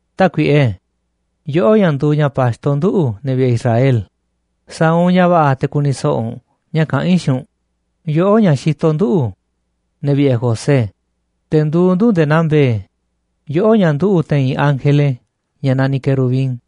Tákuiꞌe, yoꞌó ña̱ nduuꞌ ña̱ pa̱xto nduꞌu̱, ne̱ vi̱ꞌe̱ Israel, sa̱a̱ u̱nꞌ ña̱ va̱ꞌa̱ te̱ ku̱ni̱ so̱ꞌo̱ u̱nꞌ ña̱ kaꞌán i̱ xiinꞌ u̱nꞌ, yoꞌó, ña̱ xitoꞌ nduꞌu̱, ne̱ vi̱ꞌe̱ José, te̱ nduuꞌ ndu̱ nde̱e̱ naa mbe̱e̱, yoꞌó ña̱ nduꞌu̱ te̱i̱n ángele ña̱ naniꞌ querubín,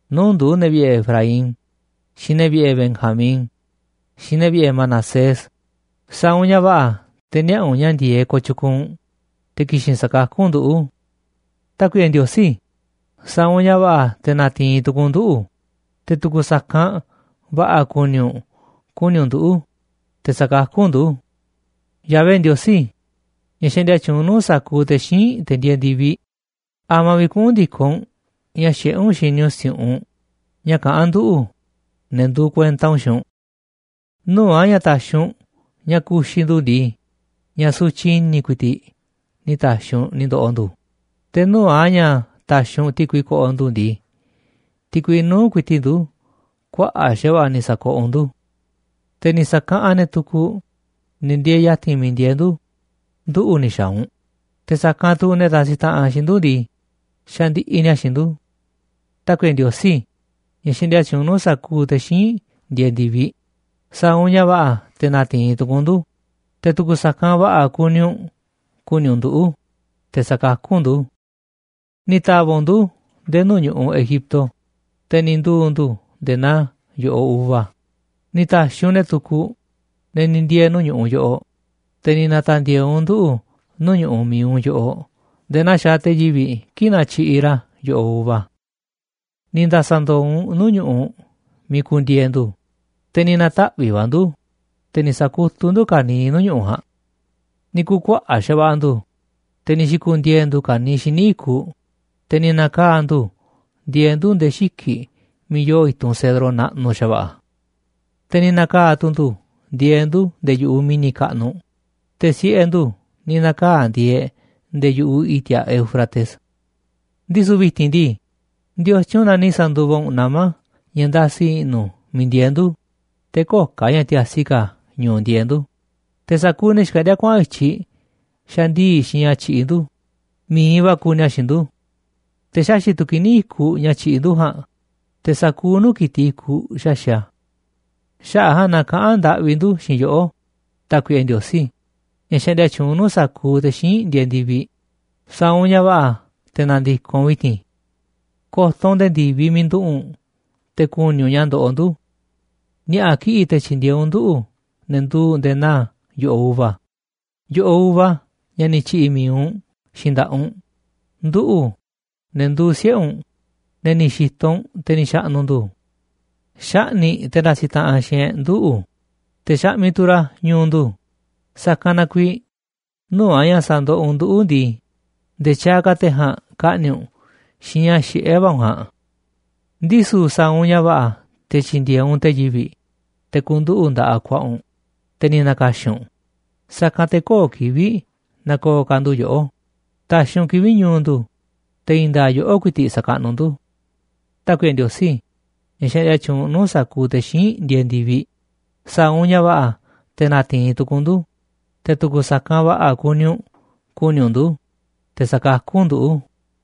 nuu̱ꞌ ndu̱, ne̱ vi̱ꞌe̱ Efraín, xiinꞌ ne̱ vi̱ꞌe̱ Benjamín, xiinꞌ ne̱ vi̱ꞌe̱ Manasés, sa̱a̱ u̱nꞌ ña̱ va̱ꞌa̱ te̱ niaꞌa̱ u̱nꞌ ña̱ ndi̱e̱eꞌ kooꞌ tyukuuꞌ u̱nꞌ, te̱ ki̱xi̱n sa̱kakú u̱nꞌ nduꞌu̱. Tákuiꞌe Ndiosí, sa̱a̱ u̱nꞌ ña̱ va̱ꞌa̱ te̱ na̱ti̱i̱n tu̱ku̱u̱ u̱nꞌ nduꞌu̱, te̱ tu̱ku̱ sa̱kanꞌ va̱ꞌa̱ kuni u̱nꞌ ku̱ni̱ u̱nꞌ nduꞌu̱, te̱ sa̱kakú u̱nꞌ ndu̱. Yahvé Ndiosí, ña̱ xaꞌndia tyuunꞌ nuu̱ꞌ sa̱kuuꞌ te̱ xíinꞌ, te̱ ndieeꞌ ndi̱viꞌ, ¿a̱ma̱ vi̱ꞌ kuꞌu̱n ndi̱koꞌ u̱nꞌ ña̱ xiꞌé u̱nꞌ xini u̱nꞌ si̱u̱ꞌunꞌ ña̱ kaꞌán nduꞌu̱, ne̱ nduuꞌ kuenta u̱nꞌ, xiinꞌ u̱nꞌ? Nuu̱ꞌ a̱ ña̱ ta̱xi̱ u̱nꞌ ña̱ ku̱xi̱ ndu̱ ndii, ña̱ sutyiꞌ i̱ni̱ ku̱i̱ti̱ꞌ ni̱ ta̱xi̱ u̱nꞌ ni̱ ndo̱ꞌo̱ ndu̱, te̱ nuu̱ꞌ a̱ ña̱ ta̱xi̱ u̱nꞌ ti̱kui ko̱ꞌo̱ ndu̱ ndii, ti̱kui nuu̱ꞌ ku̱i̱ti̱ꞌ ndu̱ kuaꞌa̱ꞌ xa̱va̱ꞌa̱ ni̱ sa̱koꞌoꞌ u̱nꞌ ndu̱. Te̱ ni̱ sakaꞌanꞌ ne̱ tukuꞌ, ne̱ ndieeꞌ ya̱ti̱n miiꞌ ndieeꞌ ndu̱, nduꞌu̱ ni̱ xa̱a̱ u̱nꞌ, te̱ sa̱kanꞌ tu̱ ne̱ ndasiꞌ taꞌanꞌ xiinꞌ ndu̱ ndii, xandiꞌiꞌ ni̱a̱ xiinꞌ ndu̱. Tákuiꞌe Ndiosí, ña̱ xaꞌndia tyuunꞌ nuu̱ꞌ sa̱kuuꞌ te̱ xíinꞌ ndieeꞌ ndi̱viꞌ, sa̱a̱ u̱nꞌ ña̱ va̱ꞌa̱ te̱ na̱ti̱i̱n tu̱ku̱u̱ u̱nꞌ ndu̱, te̱ tu̱ku̱ sa̱kanꞌ va̱ꞌa̱ kuni u̱nꞌ ku̱ni̱ u̱nꞌ nduꞌu̱, te̱ sa̱kakú u̱nꞌ ndu̱. Ni̱ ta̱va̱ꞌ u̱nꞌ ndu̱ nde̱e̱ nuu̱ꞌ ñu̱ꞌuꞌ Egipto, te̱ ni̱ nduu̱ ndu̱ nde̱e̱ naa yo̱ꞌoꞌ uva, ni̱ ta̱xiꞌ u̱nꞌ ne̱ tukuꞌ, ne̱ ni̱ ndiee̱ nuu̱ꞌ ñu̱ꞌuꞌ yoꞌoꞌ, te̱ ni̱ na̱ta̱ndi̱e̱e̱ u̱nꞌ nduꞌu̱ nuu̱ꞌ ñu̱ꞌuꞌ mi̱iꞌ u̱nꞌ yoꞌoꞌ nde̱e̱ naa xaaꞌ te̱ yivi̱ꞌ kii̱ꞌ natyiꞌiꞌ ra̱ yo̱ꞌoꞌ uva. Ni̱ nda̱sa̱ ndo̱o̱ u̱nꞌ nuu̱ꞌ ñu̱ꞌuꞌ miiꞌ ku̱ndi̱e̱e̱ ndu̱, te̱ ni̱ na̱taꞌvi̱ꞌ va̱ ndu̱, te̱ ni̱ sa̱kutuꞌ ndu̱ ka̱niiꞌ nuu̱ꞌ ñu̱ꞌuꞌ ja̱a̱nꞌ. Ni̱ ku̱kuaꞌa̱ꞌ xa̱va̱ꞌa̱ ndu̱, te̱ ni̱ xi̱ku̱ndiee̱ ndu̱ ka̱niiꞌ xíniꞌ i̱kuꞌ, te̱ ni̱ na̱kaa̱ ndu̱ ndieeꞌ ndu̱ nde̱e̱ xiki̱ꞌ miiꞌ yoo i̱tunꞌ cedro naꞌnuꞌ xa̱va̱ꞌa̱. Te̱ ni̱ na̱kaa̱ tu̱ ndu̱ ndieeꞌ ndu̱ nde̱e̱ yu̱ꞌuꞌ mi̱ni̱ kaꞌnuꞌ, te̱ siꞌe̱ ndu̱ ni̱ na̱kaa̱ ndieeꞌ nde̱e̱ yu̱ꞌuꞌ i̱ti̱a̱ Éufrates. Ndisu̱ vi̱ti̱n ndii, ¿ndiotyun na ni̱ sa̱nduva u̱nꞌ nama̱ ña̱ ndasi i̱ꞌnu̱ miiꞌ ndieeꞌ ndu̱, te̱ köo̱ꞌ ka̱ ña̱ tiasi ka̱ ñu̱u̱ ndieeꞌ ndu̱, te̱ sa̱kuuꞌ ne̱ xkaꞌndíá kuaꞌa̱n i̱tyiꞌ xandii̱ꞌ xiinꞌ ña̱ tyiꞌiꞌ ndu̱, mi̱iꞌ va̱ kuuꞌ ni̱a̱ xiinꞌ ndu̱? Te̱ xaxi̱ꞌ tu̱ kini̱ i̱kuꞌ ña̱ tyiꞌiꞌ ndu̱ ja̱a̱nꞌ, te̱ sa̱kuuꞌ nuu̱ꞌ ki̱tiꞌ i̱kuꞌ xaxi̱ꞌ a̱. Xaꞌa̱ꞌ a̱ ja̱a̱nꞌ na kaꞌán ndaꞌvi ndu̱ xiinꞌ yoꞌó, Tákuiꞌe Ndiosí, ña̱ xaꞌndia tyuunꞌ nuu̱ꞌ sa̱kuuꞌ te̱ xíinꞌ ndieeꞌ ndi̱viꞌ, sa̱a̱ u̱nꞌ ña̱ va̱ꞌa̱ te̱ na̱ndi̱koꞌ u̱nꞌ vi̱ti̱n. Ko̱to̱ u̱nꞌ nde̱e̱ ndi̱viꞌ miiꞌ nduꞌu̱ꞌ u̱nꞌ, te̱ ku̱ni̱ u̱nꞌ ña̱ ndoꞌoꞌ ndu̱. Ni̱a̱ꞌa̱ kiꞌi̱ꞌ te̱ tyi̱ndi̱e̱eꞌ u̱nꞌ nduꞌu̱, ne̱ nduuꞌ nde̱e̱ naa yo̱ꞌoꞌ uva, yo̱ꞌoꞌ uva ña̱ ni̱ tyi̱ꞌi̱ mi̱iꞌ u̱nꞌ xiinꞌ nda̱ꞌaꞌ u̱nꞌ, nduꞌu̱ꞌ, ne̱ nduuꞌ siꞌe̱ u̱nꞌ, ne̱ ni̱ xi̱to̱ u̱nꞌ te̱ ni̱ xa̱ꞌnu̱ ndu̱. Xaꞌni̱ꞌ te̱ ndasiꞌ taꞌanꞌ xiinꞌ e̱ꞌ nduꞌu̱, te̱ xaꞌmiꞌ tu̱ ra̱ ñu̱u̱ ndu̱, sa̱kanꞌ na kuiiꞌ, nuu̱ꞌ a̱ ña̱ sa̱ndoꞌoꞌ u̱nꞌ nduꞌu̱ ndii, nde̱e̱ tyaaꞌ ka̱ te̱ ja̱a̱nꞌ ka̱ꞌni̱ꞌ u̱nꞌ xiinꞌ ña̱ xiꞌé va̱ u̱nꞌ ja̱a̱nꞌ. Ndisu̱ sa̱a̱ u̱nꞌ ña̱ va̱ꞌa̱ te̱ tyi̱ndi̱e̱eꞌ u̱nꞌ te̱ yivi̱ꞌ, te̱ ku̱nduꞌu̱ꞌ nda̱ꞌaꞌ ku̱a̱ꞌa̱ u̱nꞌ, te̱ ni̱ na̱ka̱xi̱n u̱nꞌ, sa̱kanꞌ te̱ köo̱ꞌ kivi̱ꞌ na̱ko̱o̱ ka̱ ndu̱ yoꞌó, ta̱xi̱ u̱nꞌ kivi̱ꞌ ñu̱u̱ ndu̱, te̱ i̱i̱n nda̱a̱ꞌ yoꞌó ku̱i̱ti̱ꞌ sa̱kaꞌnuꞌ ndu̱. Tákuiꞌe Ndiosí, ña̱ xaꞌndia tyuunꞌ nuu̱ꞌ sa̱kuuꞌ te̱ xíinꞌ ndieeꞌ ndi̱viꞌ, sa̱a̱ u̱nꞌ ña̱ va̱ꞌa̱ te̱ na̱ti̱i̱n tu̱ku̱u̱ u̱nꞌ ndu̱, te̱ tu̱ku̱ sa̱kanꞌ va̱ꞌa̱ kuni u̱nꞌ ku̱ni̱ u̱nꞌ ndu̱, te̱ sa̱kakú u̱nꞌ nduꞌu̱.